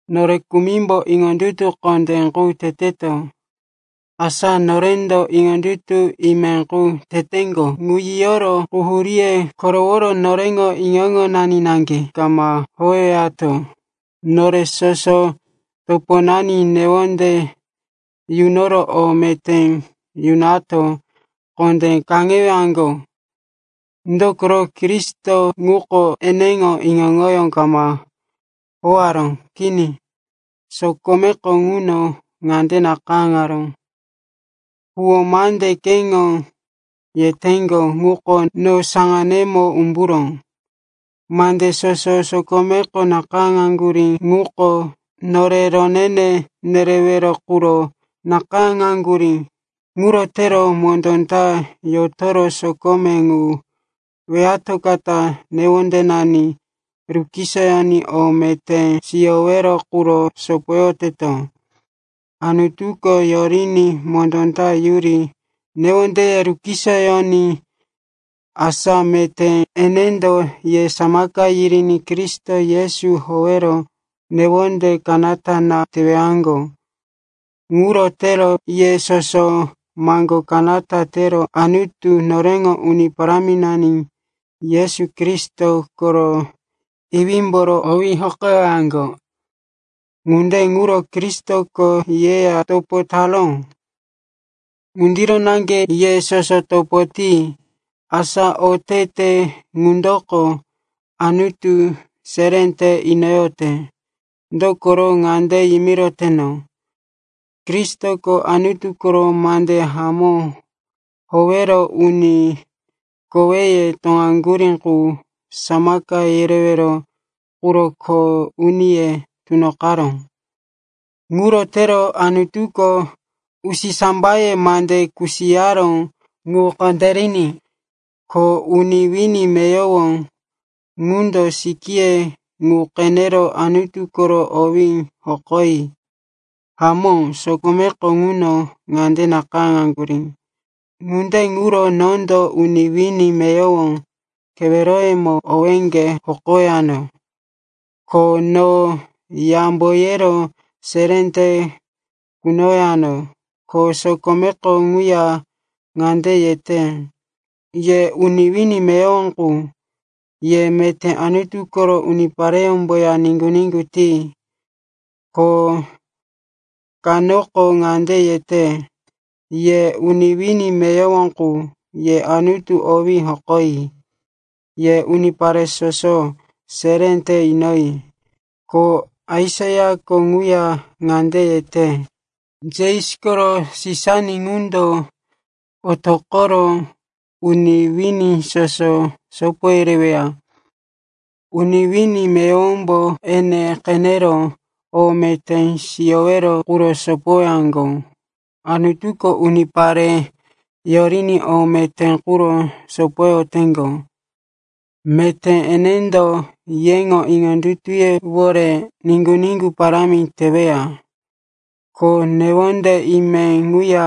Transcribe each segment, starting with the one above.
Nore kumimbo iŋondutu kondé qu teteto. Asa norendo iŋondutu ime qu teteŋgo ŋu yiyoro quhuríye koroworo noreŋo iŋo-iŋonani naŋge kama howewato. Nore soso toponani newonde yunoro o meté yunato kondé kaŋewaŋgo. Dokoro Kristo ŋuko eneŋo iŋo-iŋoyó kama howaró. Kini, sokomeko ŋuno ŋande nakayáŋaró, “Huwó mande keŋo yeteŋgo ŋuko no saŋanemo umburó.” Mande soso sokomeko nakayáŋaŋgurí ŋuko, nore ronene nerewero quro nakayáŋaŋgurí. Ŋuro tero mondó ta yotoro sokome ŋu weyatoqota newondenani rukisoyoní o meté siyowero quro sopoyoteto. Anutuko yoriní mondó ta yuri newondeye rukisoyoní. Asa meté enendo ye samaka yiriní Kristo Yesu howero newonde kanata na teyowaŋgo. Ŋuro tero ye soso maŋgo kanata tero Anutu, noreŋo Uni Paráminani Yesu Kristo koro Iwímboro owí hokoyowaŋgo. Ŋunde ŋuro Kristoko yeya topo taró ŋundiro naŋge ye soso topo ti. Asa otete ŋundoko Anutu seré te inoyote. Dokoro ŋande yimiroteno, Kristoko Anutu koro mande hamó howero uni koweye toŋaŋgurí qu samaka yerewero quro kho uniye tunoqaró. Ŋuro tero Anutuko usisambayeya mande kusiyaró ŋu kondériní, ko uni wini meyowo ŋundo sikíye ŋu qenero Anutu koro owí hokoyi. Hamó, sokomeko ŋuno ŋande nakayáŋaŋgurí, “Ŋunde ŋuro nondo uni wini meyowo keweroyemo owéŋge hokowano, ko no yambo yero seré te kunowano.” Ko sokomeko kaŋuya ŋande yete, “Ye uni wini meyowo qu, ye meté Anutu koro unipareyómboya niŋgu-niŋgu ti.” Ko kanoko ŋande yete, “Ye uni wini meyowo qu, ye Anutu owí hokoyi. Ye unipare soso, seré te inoyi.” Ko Aisaiako ŋuya ŋande yete, “Jesi koro Sisani ŋundo otoqoro uni wini soso sopo yereweya. Uni wini meyowombo ene qenero o meté siyowero quro sopowaŋgo.” Anutuko unipare yoriní o meté quro sopoyoteŋgo. Meté enendo yeŋo iŋondutuyewore niŋgu-niŋgu parámi teweya, ko newonde ime ŋuya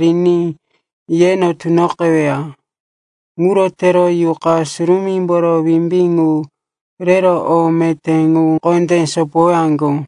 riní yeno tunoqeweya. Ŋuro tero Yuqa Surumímboro wimbí ŋu rero o meté ŋu kondé sopowaŋgo.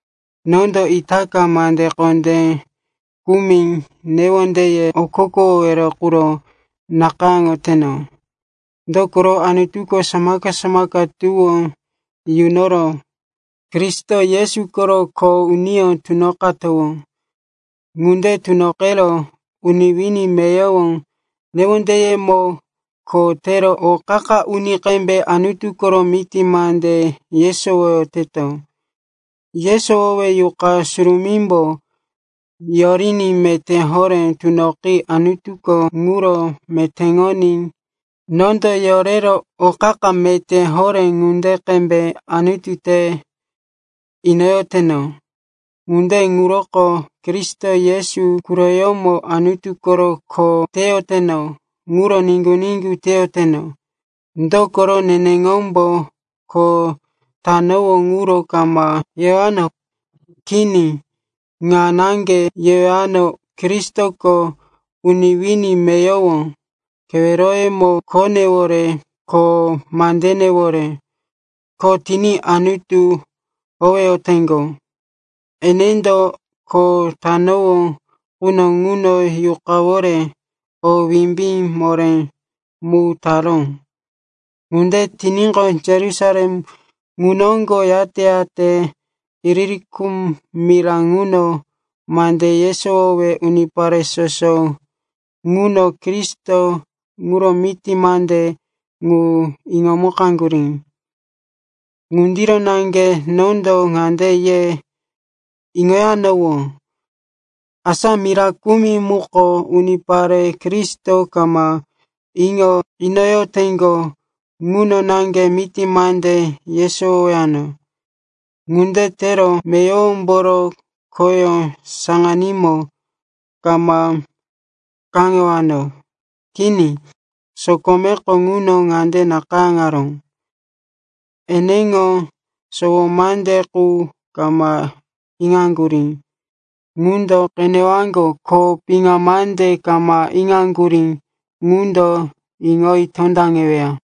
Nondo itaka mande kondé kumi newondeye okokowowero quro nakayáŋoteno. Dokoro Anutuko samaka-samaka tuwó nunoro Kristo Yesu koro kho uniyó tunoqanowó. Ŋunde tunoqero uni wini meyowo keweroyemo kho tero o qa-qa uni ŋunde qembe Anutu koro miti mande yesowoyoteno. Yesowowe Yuqa Surumímbo yoriní meté horé tunoqi Anutuko ŋuro metéŋoní nondo yorero o qa-qa meté horé ŋunde qembe Anutu te inoyoteno. Ŋunde ŋuroko Kristo Yesu quroyómo Anutu koro kho teyoteno ŋuro niŋgu-niŋgu teyoteno. Dokoro neneŋombo kho tanowó ŋuro kama yewano. Kini, ŋa naŋge yewano, Kristoko uni wini meyowo keweroyemo khonewore ko mandenewore kho tiní Anutu howeyoteŋgo. Enendo kho tanowó quno ŋuno Yuqayówore o wimbí moré mu taró. Ŋunde tiníqo, Yerusalem ŋu noŋgo yate-yate Ilirikum mira ŋuno mande yesowowe unipare soso ŋuno Kristo ŋuro miti mande ŋu iŋomukaŋgurí. Ŋundiro naŋge nondo ŋande ye iŋoyanowó, asa mira kumi muko unipare Kristo kama iŋo inoyoteŋgo ŋuno naŋge miti mande yesowowano. Ŋunde tero meyowomboro khoyó saŋanímo kama kaŋewano. Kini, sokomeko ŋuno ŋande nakayáŋaró, “Eneŋo sowo mande qu kama iŋaŋgurí ŋundo qenewaŋgo, ko piŋa mande kama iŋaŋgurí ŋundo iŋoyi tondaŋeweya.”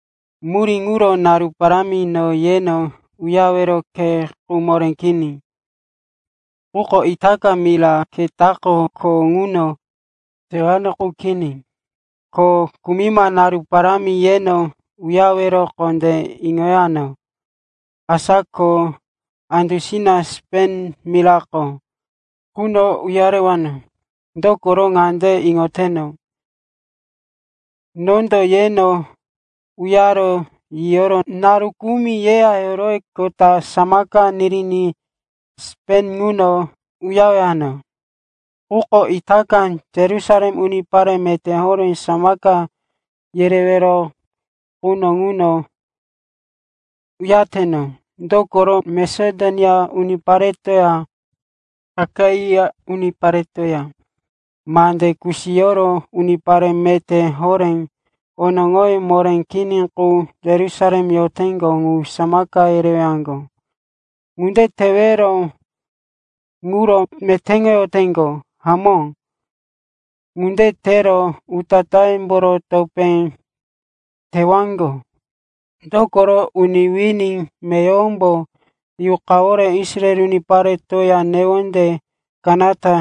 Murí ŋuro naru parámi no yeno uyarewero khe qu moré kini. Quko itaka mira ketako kho ŋuno tewano qu kini. Ko kumima naru parámi yeno uyarewero kondé iŋoyano. Asa ko andusina Spen mirako ŋuno uyarewano quno ŋuno yiyowano. Dokoro ŋande iŋoteno, nondo yeno uyaro yiyoro naru kumi yeya yoroweqota samaka niri Spen ŋuno uyarewano. Quko itaka Yerusalem unipare meté horé samaka yerewero quro ŋuno uyareteno. Dokoro Masedonia uniparetoya Akaia uniparetoya mande kusiyoro unipare meté horé onoŋoye moré kini qu Yerusalem yoteŋgo ŋu samaka yerewaŋgo. Ŋunde tewero ŋuro metéŋoyoteŋgo. Hamó, ŋunde tero utatáyemboro topé tewaŋgo. Dokoro uni wini meyowombo Yuqawore Israel uniparetoya newonde kanata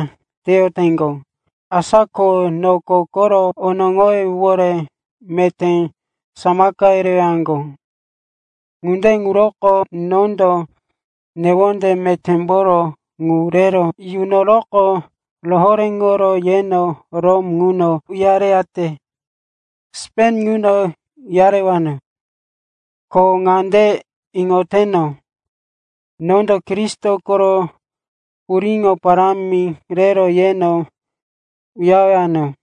teyoteŋgo. Asa ko noko koro onoŋoyewore meté samaka yerewaŋgo. Ŋunde ŋuroko nondo newonde metémboro ŋu rero yunoroqo rohoréŋoro yeno Rom ŋuno uyareyate Spen ŋuno uyarewano. Ko ŋande iŋoteno, nondo Kristo koro puriŋo parámi rero yeno uyarewano.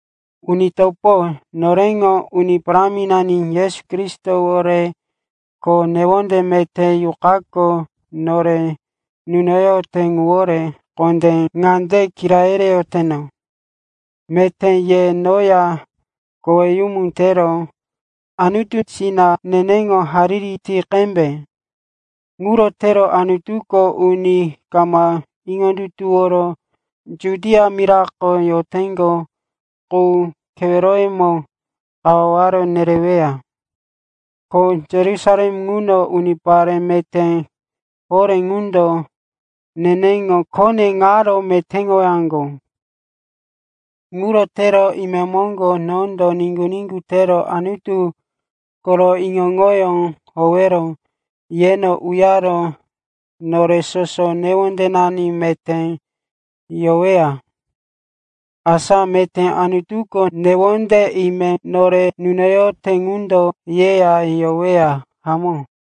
Uni topo, noreŋo Uni Paráminani Yesu Kristowore ko newonde meté Yuqako nore nunoyote ŋuwore kondé ŋande kira yereyoteno, meté ye noya koweyumu tero Anutusina neneŋo hariri ti qembe. Ŋuro tero Anutuko uni kama iŋondutuworo Judia mirako yoteŋgo qu keweroyemo kawaware nereweya. Ko Yerusalem ŋuno unipare meté horé ŋundo neneŋo khone ŋaro metéŋowaŋgo. Ŋuro tero imemoŋgo nondo niŋgu-niŋgu tero Anutu koro iŋo-iŋoyó howero yeno uyaro nore soso newondenani meté yoweya. Asa meté Anutuko newonde ime nore nunoyote ŋundo yeya yoweya. Hamó.